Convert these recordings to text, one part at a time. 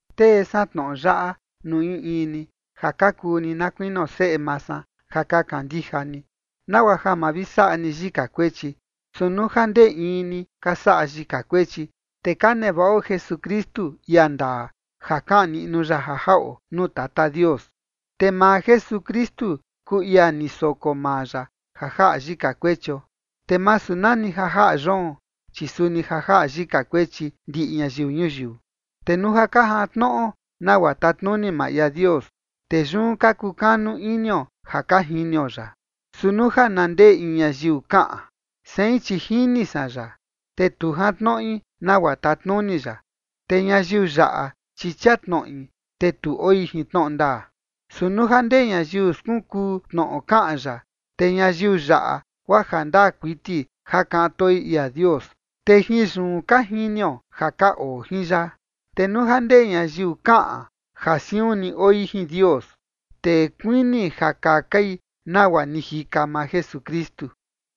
Tee san tnoꞌo yaꞌa nuu in in ni ja ka kuu ni na kuinio seꞌe maa san ja ka kandija ni, nagua ja ma vi saꞌa ni yika kuechi. Su nuu ja ndee in ni ka saꞌa yika kuechi, te ka nevaꞌo Jesukristu, ia ndaa, ja kaꞌan niꞌnu ya ja jaꞌo nuu Tata Dios. Te maa Jesukristu kuu ia ni soko maa ya ja jaꞌa yika kuechio, te masu nani ja jaꞌa yoon, chi suni ja jaꞌa yika kuechi ndiꞌi ñayiu ñuyiu. Te nuu ja ka jantnoꞌo nagua tatnuni maa ia Dios, te yun ka kukanu inio ja ka jinio ya. Su nuu ja na ndee in ñayiu kaꞌan: “Sein, chi jini san ya”, te tu jantnoꞌi nagua tatnuni ya, te ñayiu yaꞌa, chi chia tnoꞌi, te tu oi jin tnoꞌo ndaa. Su nuu ja ndee ñayiu skunkuu tnoꞌo kaꞌan ya, te ñayiu yaꞌa guaa jandaa kuiti ja kaꞌan toi ia Dios. Te jin yun ka jinio ja ka oo jin ya. Te nuu ja ndee ñayiu kaꞌan ja siun ni oi jin Dios, te kuini ja kakai nagua ni jika maa Jesukristu.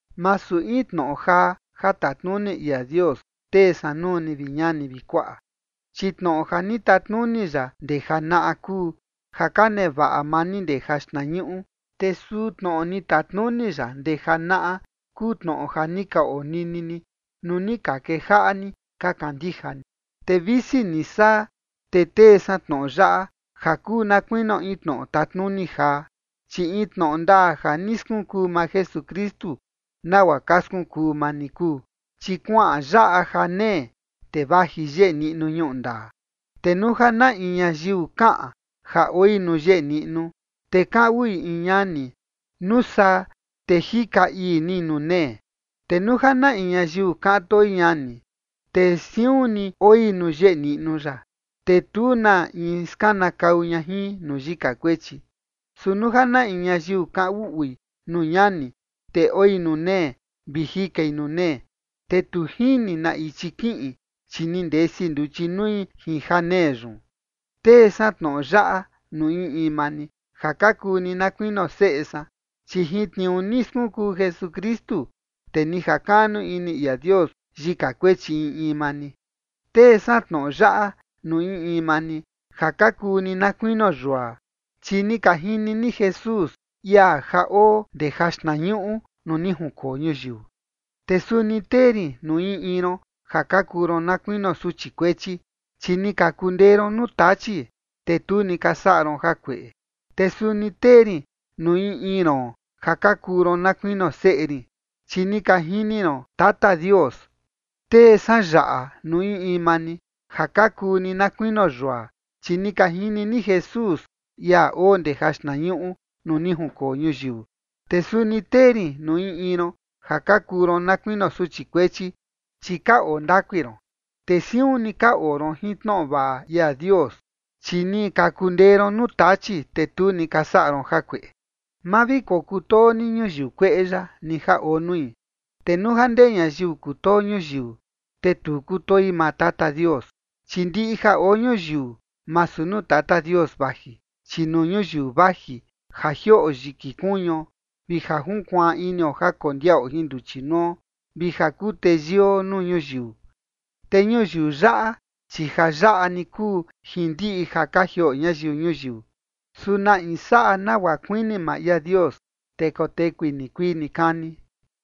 Masu in tnoꞌo jaa ja tatnuni ia Dios tee san nuu ni, vi ñani vi kuaꞌa, chi tnoꞌo ja ni tatnuni ya ndee janaꞌa kuu, ja ka nevaꞌa maa ni ndee ja xtnañuꞌu, te suu tnoꞌo ni tatnuni ya ndee janaꞌa kuu tnoꞌo ja ni ka onini ni nuu ni ka kejaꞌa ni ka kandija ni. Te visi ni saa, te tee san tnoꞌo yaꞌa ja kuu na kuinio in tnoꞌo tatnuni jaa, chi in tnoꞌo ndaa ja ni skunkuu maa Jesukristu nagua ka skunkuu maa ni kuu, chi kuaꞌan yaꞌa janee, te vaji yeꞌe niꞌnu ñuꞌu ndaa. Te nuu ja na in ñayiu kaꞌan ja oi nuu yeꞌe niꞌnu, te kaꞌan uꞌui in ñani, nuu saa, te jika ii ni nuu nee. Te nuu ja na in ñayiu kaꞌan toi ñani, te siun ni oi nuu yeꞌe niꞌnu ya, te tu na in skanakau ña jin nuu yika kuechi. Su nuu ja na in ñayiu kaꞌan uꞌui nuu ñani, te oi nuu nee vi jikai nuu nee, te tu jini na ichi kiꞌin, chi ni ndesi nduchi nui jin janee yun. Tee san tnoꞌo yaꞌa nuu in in maa ni, ja ka kuu ni na kuinio seꞌe san, chi jin tniuu ni skunkuu Jesukristu, te ni jakaꞌnu ini ia Dios yika kuechi in in maa ni. Tee san tnoꞌo yaꞌa nuu in in maa ni ja ka kuu ni na kuinio yua, chi ni ka jini ni Jesús, ia ja oo ndee jaxtnañuꞌu nuu ni junkoo ñuyiu. Te suni tee rin nuu in in ron ja ka kuu ron na kuinio suchi kuechi, chi ni ka kundee ron nuu Tachi, te tu ni ka saꞌa ron jakueꞌe. Te suni tee rin nuu in in ron ja ka kuu ron na kuinio seꞌe rin, chi ni ka jini ron Tata Dios. Tee san yaꞌa nuu in in maa ni ja ka kuu ni na kuinio yua, chi ni ka jini ni Jesús, ia oo ndee jaxtnañuꞌu nuu ni junkoo ñuyiu. Te suni tee rin nuu in in ron ja ka kuu ron na kuinio suchi kuechi, chi ka oo ndakui ron, te siun ni ka oo ron jin tnoꞌo vaꞌa ia Dios, chi ni ka kundee ron nuu Tachi, te tu ni ka saꞌa ron jakueꞌe. Ma vi kokutoo ni ñuyiu kueꞌe yaꞌa, ni ja oo nui. Te nuu ja ndee ñayiu kutoo ñuyiu, te tu kutoi maa Tata Dios. Chi ndiꞌi ja oo ñuyiu masu nuu Tata Dios vaji, chi nuu ñuyiu vaji ja jioꞌo yiki kuñuo vi ja junkuaan inio ja kondiaꞌo jin nduchi nuo, vi ja kuu teyio nuu ñuyiu. Te ñuyiu yaꞌa, chi ja yaꞌa ni kuu jin ndiꞌi ja ka jioꞌo ñayiu ñuyiu, su na in saꞌa nagua kuini maa ia Dios, te kotekui nikuii nikani.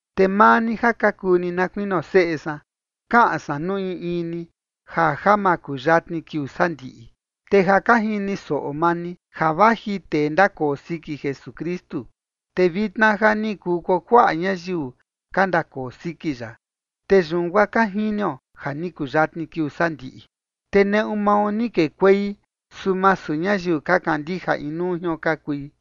Te maa ni ja ka kuu ni na kuinio seꞌe san, kaꞌan san nuu in in ni ja ja makuyatni kiuu sandiꞌi. Te ja ka jini soꞌo maa ni ja vaji tee ndakoo siki Jesukristu, te vitna ja ni kuu kuakuaꞌa ñayiu ka ndakoo siki ya, te yun guaa ka jinio ja ni kuyatni kiuu sandiꞌi. Te neꞌu mao ni kekuei, su masu ñayiu ka kandija inuu jion ka kui,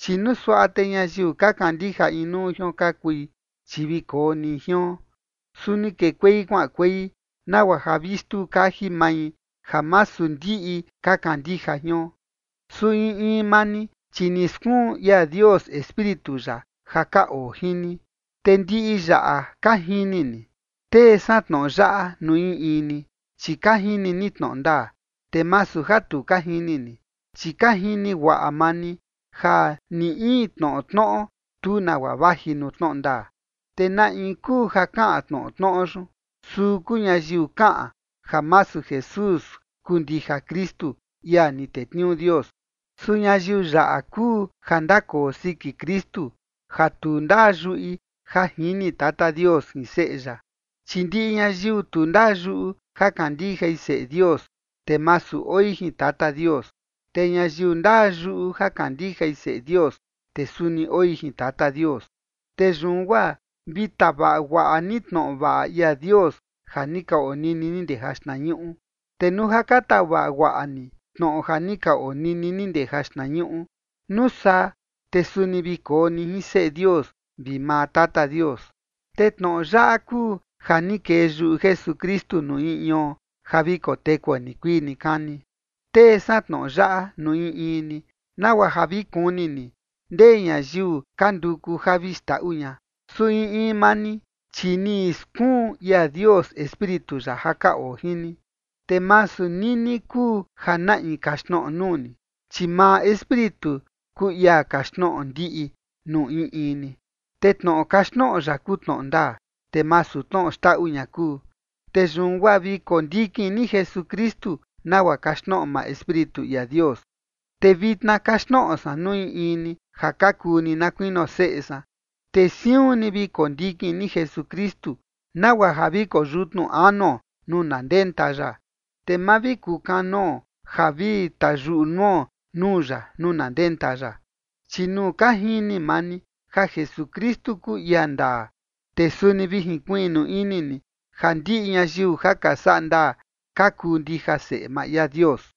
chi nuu suaꞌa te ñayiu ka kandija inuu jion ka kui, chi vi koo ni jion. Su ni kekuei kuaꞌankuei nagua ja vi xtuu kaji mai ja masu ndiꞌi ka kandija jion. Su in in maa ni, chi ni skuun ia Dios Espíritu ya ja ka oo jin ni, te ndiꞌi yaꞌa ka jini ni. Tee san tnoꞌo yaꞌa nuu in in ni, chi ka jini ni tnoꞌo ndaa, te masu ja tu ka jini ni, chi ka jini guaꞌa maa ni ja ni in tnoꞌo tnoꞌo, tu nagua vaji nuu tnoꞌo ndaa. ¿Te na in kuu ja kaꞌan tnoꞌo tnoꞌo yun? Suu kuu ñayiu kaꞌan ja masu Jesús kuu ndija Kristu, ia ni tetniuu Dios. Su ñayiu yaꞌa kuu ja ndakoo siki Kristu ja tu ndaa yuꞌi ja jini Tata Dios jin Seꞌe ya. Chi ndiꞌi ñayiu tu ndaa yuꞌu ja kandijai Seꞌe Dios, te masu oi jin Tata Dios. Te ñayiu ndaa yuꞌu ja kandijai Seꞌe Dios, te suni oi jin Tata Dios. Te yun guaa vi tavaꞌa guaꞌa ni tnoꞌo vaꞌa ia Dios ja ni ka onini ni ndee jaxtnañuꞌu. Te nuu ja ka tavaꞌa guaꞌa ni tnoꞌo ja ni ka onini ni ndee jaxtnañuꞌu, nuu saa, te suni vi koo ni jin Seꞌe Dios vi maa Tata Dios. Te tnoꞌo yaꞌa kuu ja ni kee yuꞌu Jesukristu nuu in ion ja vi kotekuo nikuii nikani. Tee san tnoꞌo yaꞌa nuu in in ni, nagua ja vi kuni ni ndee ñayiu ka nduku ja vi xndaꞌu ña. Su in in maa ni, chi ni skuun ia Dios Espíritu ya ja ka oo jin ni, te masu nini kuu ja na in kaxtnoꞌo nuu ni, chi maa Espíritu kuu ia kaxtnoꞌo ndiꞌi nuu in in ni, te tnoꞌo kaxtnoꞌo ya kuu tnoꞌo ndaa, te masu tnoꞌo xndaꞌu ña kuu. Te yun guaa vi kondikin ni Jesukristu, nagua kaxtnoꞌo maa Espíritu ia Dios. Te vitna kaxtnoꞌo san nuu in in ni ja ka kuu ni na kuinio seꞌe san, te siun ni vi kondikin ni Jesukristu, nagua ja vi koyutnu anuo nuu na ndenta ya, te ma vi kukanoo ja vi tayuꞌu nuo nuu ya nuu na ndenta ya. Chi nuu ka jini maa ni ja Jesukristu kuu ia ndaa, te suni vi jinkuiꞌnu ini ni ja ndiꞌi ñayiu ja ka saꞌa ndaa ka kuu ndija seꞌe maa ia Dios.